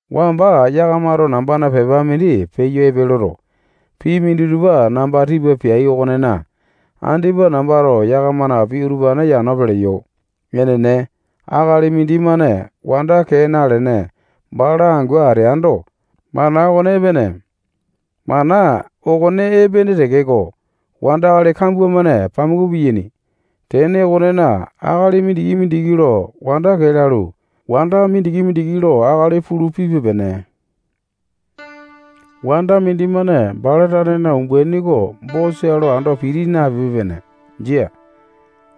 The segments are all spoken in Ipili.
Wamba yakamato nambana pepa mindi peyo epe loto, pii minditupa namba tipa peai okonena, andipa nambato yakamana pii utupane yano peleyo. Enene, akali mindimane wanda kee nalene, bala angu ateando, mana okone epene. Mana okone epene tekeko, wandakali kambua-mane pamuku piyaini. Tene okonena, akali mindiki-mindiki lo wanda kee lalu, wanda mindiki-mindiki lo akali mindi pulu, pipe-pene. Wanda mindimane bala tanena umbaini oko bosa lo ando piti napipe-pene. Jia.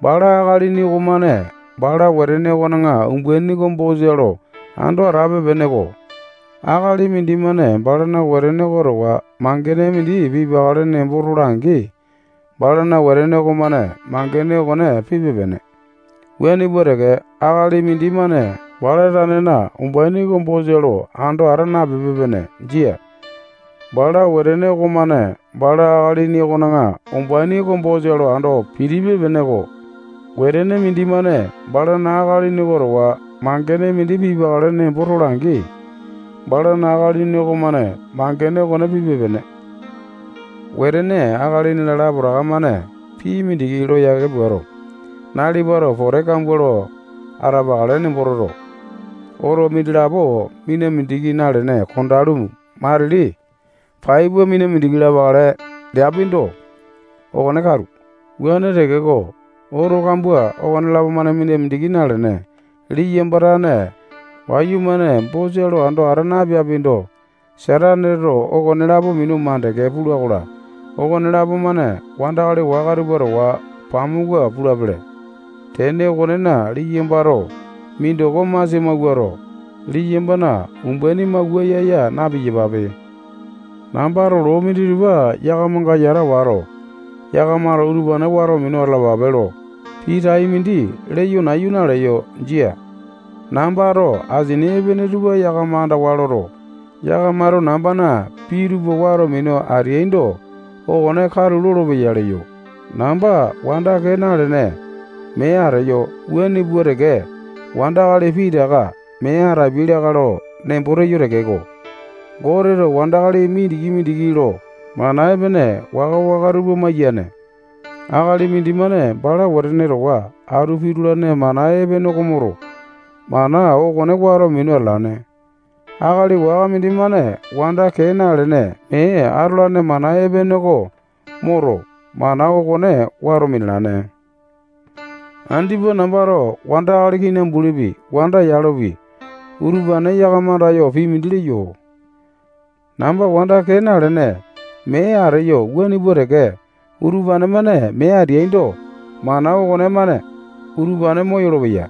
Bala akalini okomane bala wetene okona umbaini oko bosa lo ando atape-peneko. Akalini mindimane balana wetene oko towa mangene mindi pipakale nembo tola-angi, balana wetene okomane mangene okone pipe-pene. Wuane pua teke, akali mindimane bala tanena umbaini oko bosa lo ando ata napipe-pene. Jia. Bala wetene okomane bala akalini okona umbaini oko bosa lo ando pitipe-peneko. Wetene mindimane balana akalini oko towa mangene mindi pipakale nembo tola-angi, balana akalini okomane mangene okone pipe-pene. Wetene akalini-la, lapotaka-mane pii mindi lo yake puato, nalipato pote kambua lo atapakale nembo toto, oto mindilapo mina mindiki nalene kondalu, matili pai pua mina mindiki lapakale leapindo, okone katu. Wuane tekeko, oto kambua okonelapo-mane mina mindiki nalene, liyamba tane wayumane bosa lo ando ata napeapindo, Sataneto okonelapo minu mandeke pula-kola, okonelapo-mane wandakali waka tupa towa pamuku pulapele. Tene okonena, liyambato mindoko masia mawuato, liyambana umbaini mawua yaa-yaa na-piyapape. Nambato loo minditupa yakamanga yata wato, yakamato utupane wato minu atalapape lo pii tai mindi leyo nayu naleyo. Jia. Nambato asini epene tupa yakama andawa loto, yakamato nambana pii utupa wato minu ateaindo, okone katu olopeya leyo. Namba wanda kee nalene, mee ateyo wuane pua teke, wandakali pitaka mee yakama tane angu atapiai lakae lo nembo teyo tekeko, Goteto wandakali mindiki-mindiki lo mana epene waka-waka tupa maiyane. Akali mindimane bala wetene towa atu pitulane mana epene oko moto, mana okone wato minu atalane. Akali waka mindimane wanda kee nalene, mee atolane mana epene oko moto, mana okone wato minalane. Andipa nambato wandakali kinambulipi, wanda yalopi, utupane yakama andayo pii mindi leyo. Namba wanda kee nalene, mee ateyo wuane pua teke, utupane-mane mee ateaindo, mana okonemane utupane moyolo-peya.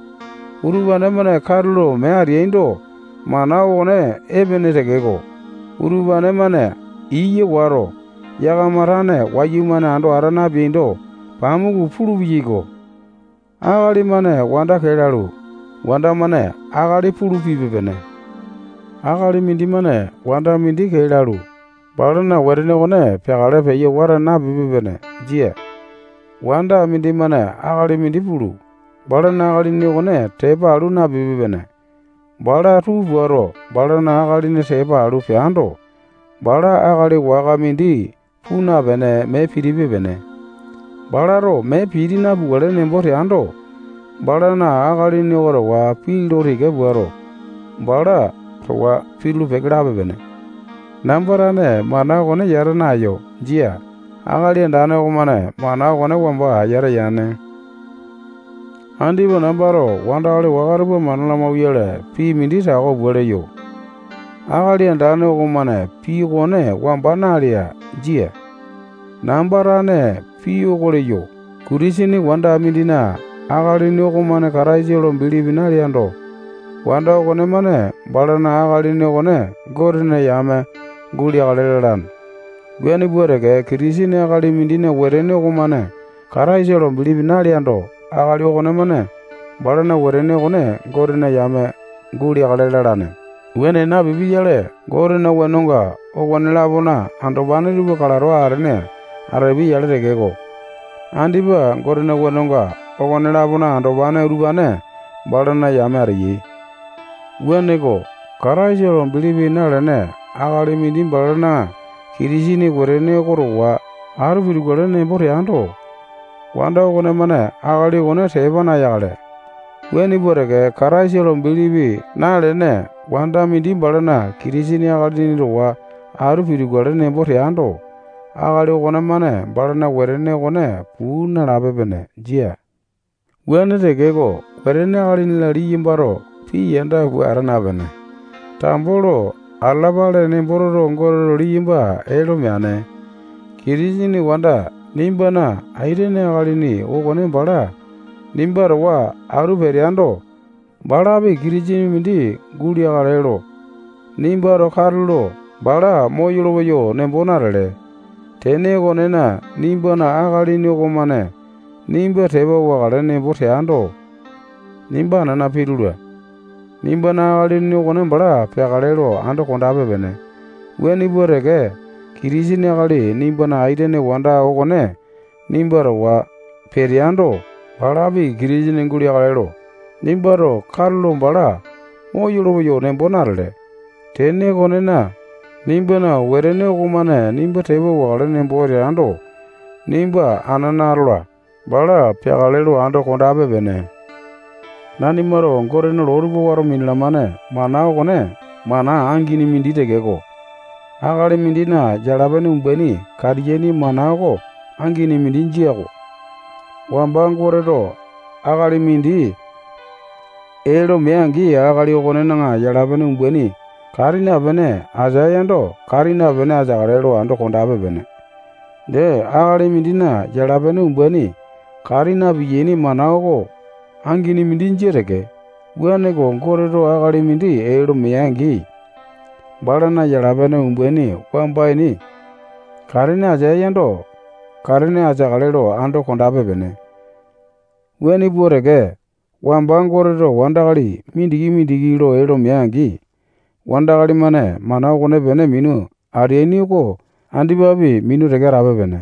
Utupane-mane katulo mee ateaindo, mana okone epene tekeko, utupane-mane iya wato, yakama tane wayumane ando ata napeaindo, pamuku pulu-peyaiko. Akali-mane wanda kee lalu, wanda-mane akali pulu pipe-pene. Akali mindimane wanda mindi kee lalu, balana wetene okone peakale peyo wata napipe-pene. Jia. Wanda mindimane akali mindi pulu, balana akalini okone tepa alu napupe-pene. Bala tuu puato, balana akalini tepa alu peando, bala akali waka mindi puu napene, mee pitipe-pene. Balato mee piti napukale nembo teando, balana akalini oko towa pii lo tika puato, bala towa pitulu-peke lape-pene. Namba tane mana okone yata naeyo. Jia. Akali Andane okomane mana okone wamba yata yane. Andipa nambato wandakali waka tupa mana lamauwayale, pii mindi tako pua leyo. Akali Andane okomane pii okone wamba nalea. Jia. Namba tane pii oko leyo. Kitisene wanda mindina akalini okomane Kataisa lo bilipi naleando, wanda okonemane balana akalini okone Gotena yame guleakale lalane. Wuane pua teke, Kitisene akali mindina wetene okomane Kataisa lo bilipi naleando, akali okonemane balana wetene okone Gotena yame guleakale lalane. Wuane napipia-yale, Gotena wenonga okone-lapona andopane tupa kalato atene atapiai-yale tekeko, andipa Gotena wenonga okone-lapona andopane utupane balana yame ateyai. Wuaneko, Kataisa lo bilipi nalene akali mindi balana Kitisene wetene oko towa atu pitukale nembo teando, wanda okonemane akali okone tepa nayakale. Wuane pua teke, Kataisa lo bilipi nalene wanda mindi balana Kitisene akalini towa atu pitukale nembo teando, akali okonemane balana wetene okone puu nalape-pene. Jia. Wuane tekeko, wetene akalini-la liyambato pii yanda pua ata napene, tambo lo atalapale nembo toto, Goteto liyamba ee lo meane. Kitisene wanda nimbana aitene akalini okone bala nimba towa atu peteando, balapi Kitisene mindi guleakale lo nimbato katulo bala moyolo-peyo nembo natele. Tene okonena, nimbana akalini okomane nimba tepa wakale nembo teando, nimba anana pitula. Nimbana akalini okone bala peakale lo ando kondape-pene. Wuane pua teke, Kitisene akali nimbana aitene wanda okone nimba towa peteando, balapi Kitisene guleakale lo nimbato katulo bala moyolo-peyo nembo natele. Tene okonena, nimbana wetene okomane nimba tepa wakale nembo teando, nimba anana atola. Bala peakale lo ando kondape-pene. Nanimato Gotena loo tupa wato minalamane mana okone mana angini mindi tekeko, akali mindina yala-pene umbaini katiyaini mana oko angini mindi jia-ko. Wamba Goteto akali mindi ee lo mea-angi, akali okonena yala-pene umbaini kati napene ateae yando, kati napene ateakale lo ando kondape-pene. Dee, akali mindina yala-pene umbaini kati na-piyaini mana oko angini mindi jia teke. Wuaneko, Goteto akali mindi ee lo mea-angi, balana yala-pene umbaini wamba ini katene ateae yando, katene ateakale lo ando kondape-pene. Wuane pua teke, wamba Goteto wandakali mindiki-mindiki lo ee lo mea-angi, wandakali-mane mana okonepene minu ateaini oko andipapi minu teke atape-pene.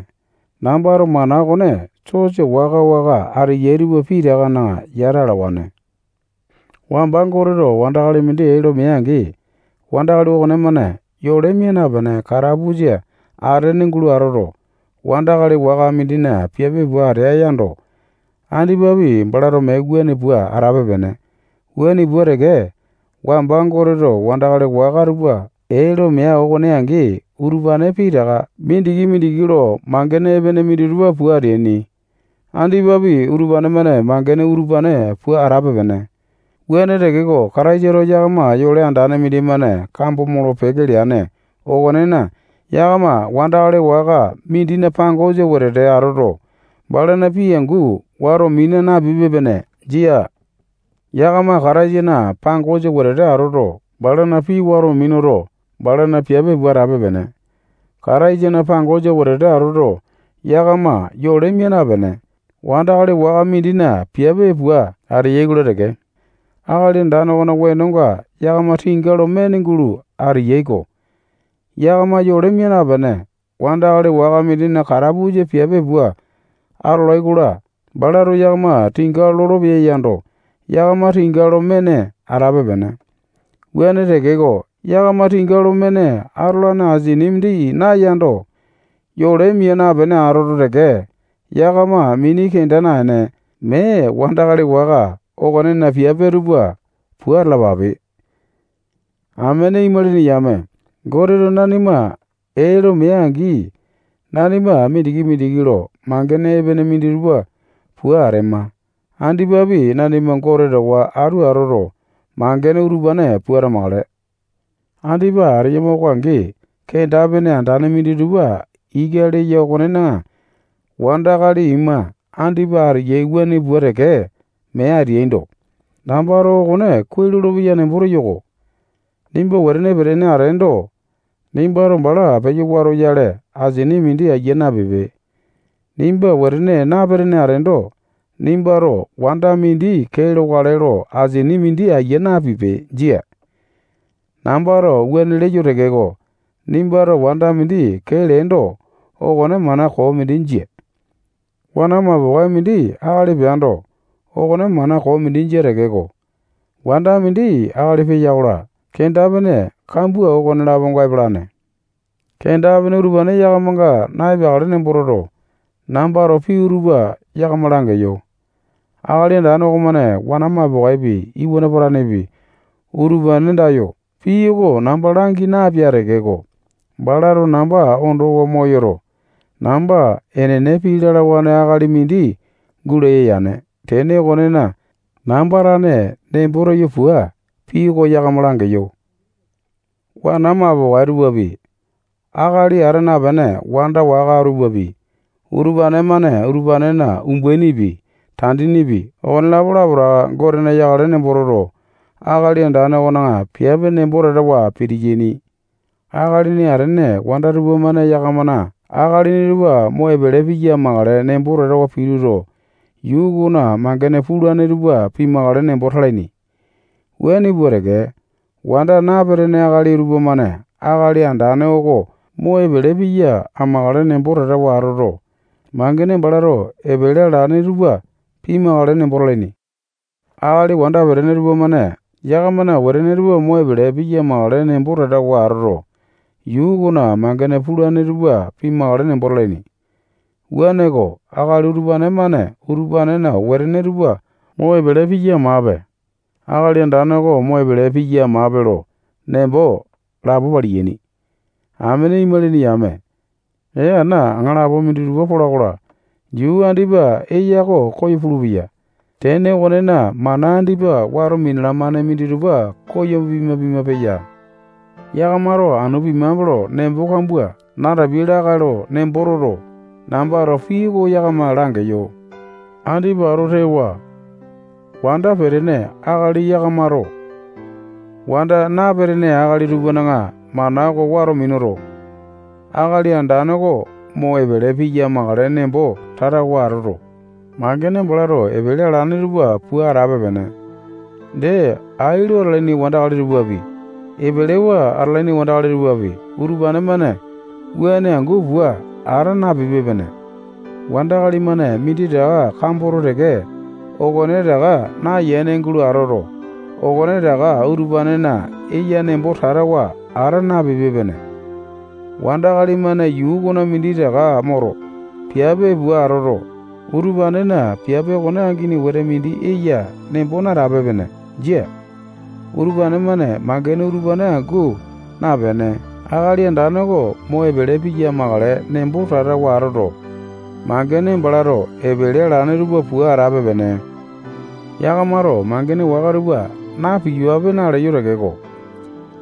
Nambato mana okone sosa waka-waka ateyai tupa pitakana yata alawane. Wamba Goteto wandakali mindi ee lo mea-angi, wandakali okonemane yole mia napene, katapusa atene gulo atoto, wandakali waka mindina piape pua atea yando, andipapi balato mee wuane pua atape-pene. Wuane pua teke, wamba Goteto wandakali waka tupa ee lo mea okone angi, utupane pitaka mindiki-mindiki lo mangene epene minditupa pua ateai. Andipapi utupane-mane mangene utupane pua atape-pene. Wuane tekeko, Kataisato yakama yole andane mindimane kambo molo-peke leane okonena, yakama wandakali waka mindina pangosa wetete atoto, balana pii angu wato mina napipe-pene. Jia. Yakama Kataisana pangosa wetete atoto, balana pii wato minuto, balana piape pua atape-pene. Kataisana pangosa wetete atoto, yakama yole mia napene, wandakali waka mindina piape pua ateyai-kola teke, Akali Andane okona wenonga yakama tinga lo mene gulo ateyai-ko. Yakama yole mia napene, wandakali waka mindina katapusa piape pua atolai-kola, balato yakama tinga lolopeya yando, yakama tinga lo mene atape-pene. Wuane tekeko, yakama tinga lo mene atolane asini mindi nayando, yole mia napene atoto teke, yakama mini kenda naene, mee wandakali waka okonena piape tupa pua atalapape. Amene imalini yame, Goteto nanima ee lo mea-angi, nanima mindiki-mindiki lo mangene epene minditupa pua atema. Andipapi, nanima Gote towa atu atoto, mangene utupane pua atamakale. Andipa ateyama oko angi, kenda-pene andane minditupa ika leya okonena, wanda akali ima andipa ateyai wuane pua teke mee ateaindo, nambato okone kuai lolopeya nembo teyo-ko. Nimba wetene petene ateendo, nimbato bala peyo watoyale, asini mindi aiya napipe. Nimba wetene napetene ateendo, nimbato wanda mindi kee lokale lo asini mindi aiya napipe. Jia. Nambato wuane leyo tekeko, nimbato wanda mindi kee leendo, okone mana koo mindi jia. Wana mapokae mindi akali peando, okone mana koo mindi jia tekeko, wanda mindi akali peya-kola, kenda-pene kambua okone-laponga epalane. Kenda-pene utupane yakamanga na-epeakale nembo toto, nambato pii utupa yakama langeyo. Akali Andane okomane wana mapokaepi, iwana patanepi, utupane andayo pii oko namba langi napea tekeko, balato namba ondowa moyoto, namba enene pii lalawane akali mindi gulaya yane. Tene okonena, namba tane nembo teyo pua, pii oko yakama langeyo. Wana mapokae tupapi, akalini ata napene wanda waka tupapi, utupane-mane utupanena umbainipi, tandinipi, okonelapo lapotaka Gotena yakale nembo toto, Akali Andane okona piape nembo tatawa pitiyaini. Akalini atene wanda tupamane yakamana akalini tupa mo epele piya amakale nembo tatawa pituto, yuu okona mangene pulane tupa pimakale nembo talaini. Wuane pua teke, wanda napetene akali tupamane Akali Andane oko mo epele piya amakale nembo tatawa atoto, mangene balato epele alane tupa pimakale nembo talaini. Akali wanda petene tupamane yakamana wetene tupa mo epele piya amakale nembo tatawa atoto, yuu okona mangene pulane tupa pimakale nembo talaini. Wuaneko, akali utupane-mane utupanena wetene tupa mo epele piya amape, Akali Andane oko mo epele piya amape lo nembo lapo paliyaini. Amene imalini yame, ee ana aŋalapo minditupa pola-kola, yuu andipa eya oko koyo pulupeya. Tene okonena, mana andipa wato minalamane minditupa koyo pima-pima peyai. Yakamato anu pimape lo nembo kambua natapiai lakae lo nembo toto, nambato pii oko yakama langeyo. Andipa ato tewa wanda petene akali yame yakamato wanda napetene akali tupana mana oko wato minuto, Akali Andane oko mo epele piya amakale nembo tatawa atoto, mangene balato epele alane tupa pua atape-pene. Dee, ai lo atalaini wandakali tupapi, epelewa atalaini wandakali tupapi, utupane-mane wuane angu pua ata napipe-pene. Wandakali-mane minditaka kamboto teke, okonetaka nayene gulo atoto, okonetaka utupanena eya nembo tatawa ata napipe-pene. Wandakali-mane yuu okona minditaka moto, piape pua atoto, utupanena piape okone angini wete mindi eya nembo natape-pene. Jia. Utupane-mane mangene utupane angu napene, Akali Andane oko mo epele piya amakale nembo tatawa atoto, mangene balato epele alane tupa pua atape-pene. Yakamato mangene waka tupa na-piyapape naleyo tekeko,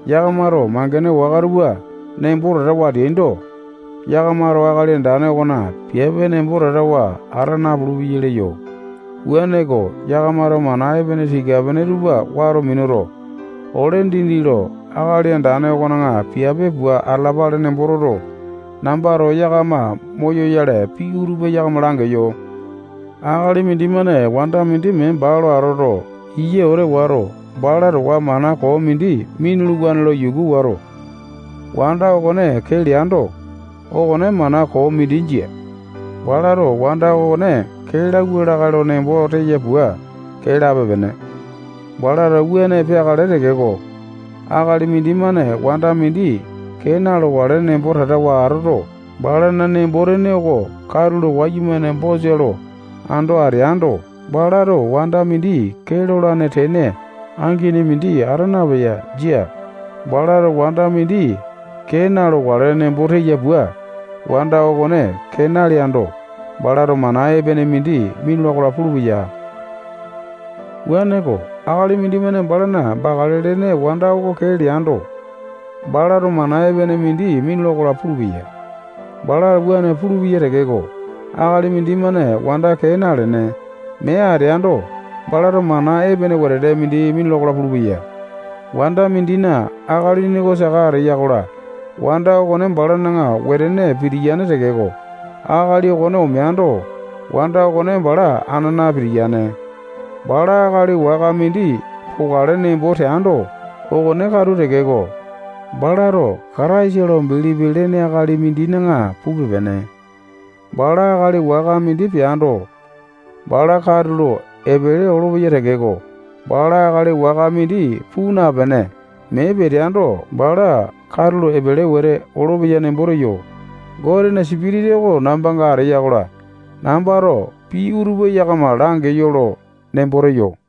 yakamato mangene waka tupa nembo tatawa ateaindo, yakamato Akali Andane okona piape nembo tatawa ata napulu-peyai leyo. Wuaneko, yakamato mana epene tika-pene tupa wato minuto, ole dindi lo Akali Andane okona piape pua atalapale nembo toto, nambato yakama moyoyale, pii utupa yakama langeyo. Akali mindimane wanda mindi mee baa lo atoto, iya wete wato, bala towa mana koo mindi minuluwane lo yuku wato, wanda okone kee leando, okone mana koo mindi jia. Balato wanda okone kee lauwa lakae lo nembo teya pua, kee lape-pene. Balato wuane peakale tekeko, akali mindimane wanda mindi kee na-lokale nembo tatawa atoto, balana nembo-tene oko katulo wayumane bosa lo ando ateando, balato wanda mindi kee lolane tene angini mindi ata napeya. Jia. Balato wanda mindi kee na-lokale nembo teya pua wanda okone kee naleaindo, balato mana epene mindi minula-kola pulupeya. Wuaneko, akali mindimane balana bakale lene wanda oko kee leando, balato mana epene mindi minula-kola pulupeya. Balato wuane pulupeya tekeko, akali mindimane wanda kee nalene, mee ateando, balato mana epene wete mindi minula-kola pulupeya. Wanda mindina akalini oko saka ateya-kola, wanda okone balana wetene pitiyane tekeko, akali okone omeando, wanda okone bala anana pitiyane. Bala akali waka mindi pokale nembo teando, okone katu tekeko, balato Kataisa lo bilipi lene akali mindina pupe-pene. Bala akali waka mindi peando, bala katulo epele olopeya tekeko, bala akali waka mindi puu napene, mee peteando, bala katulo epele wete olopeya nembo teyo. Gotena Sipitasa oko nambanga ateya-kola, nambato pii utupa yakama langeyo lo nembo teyo.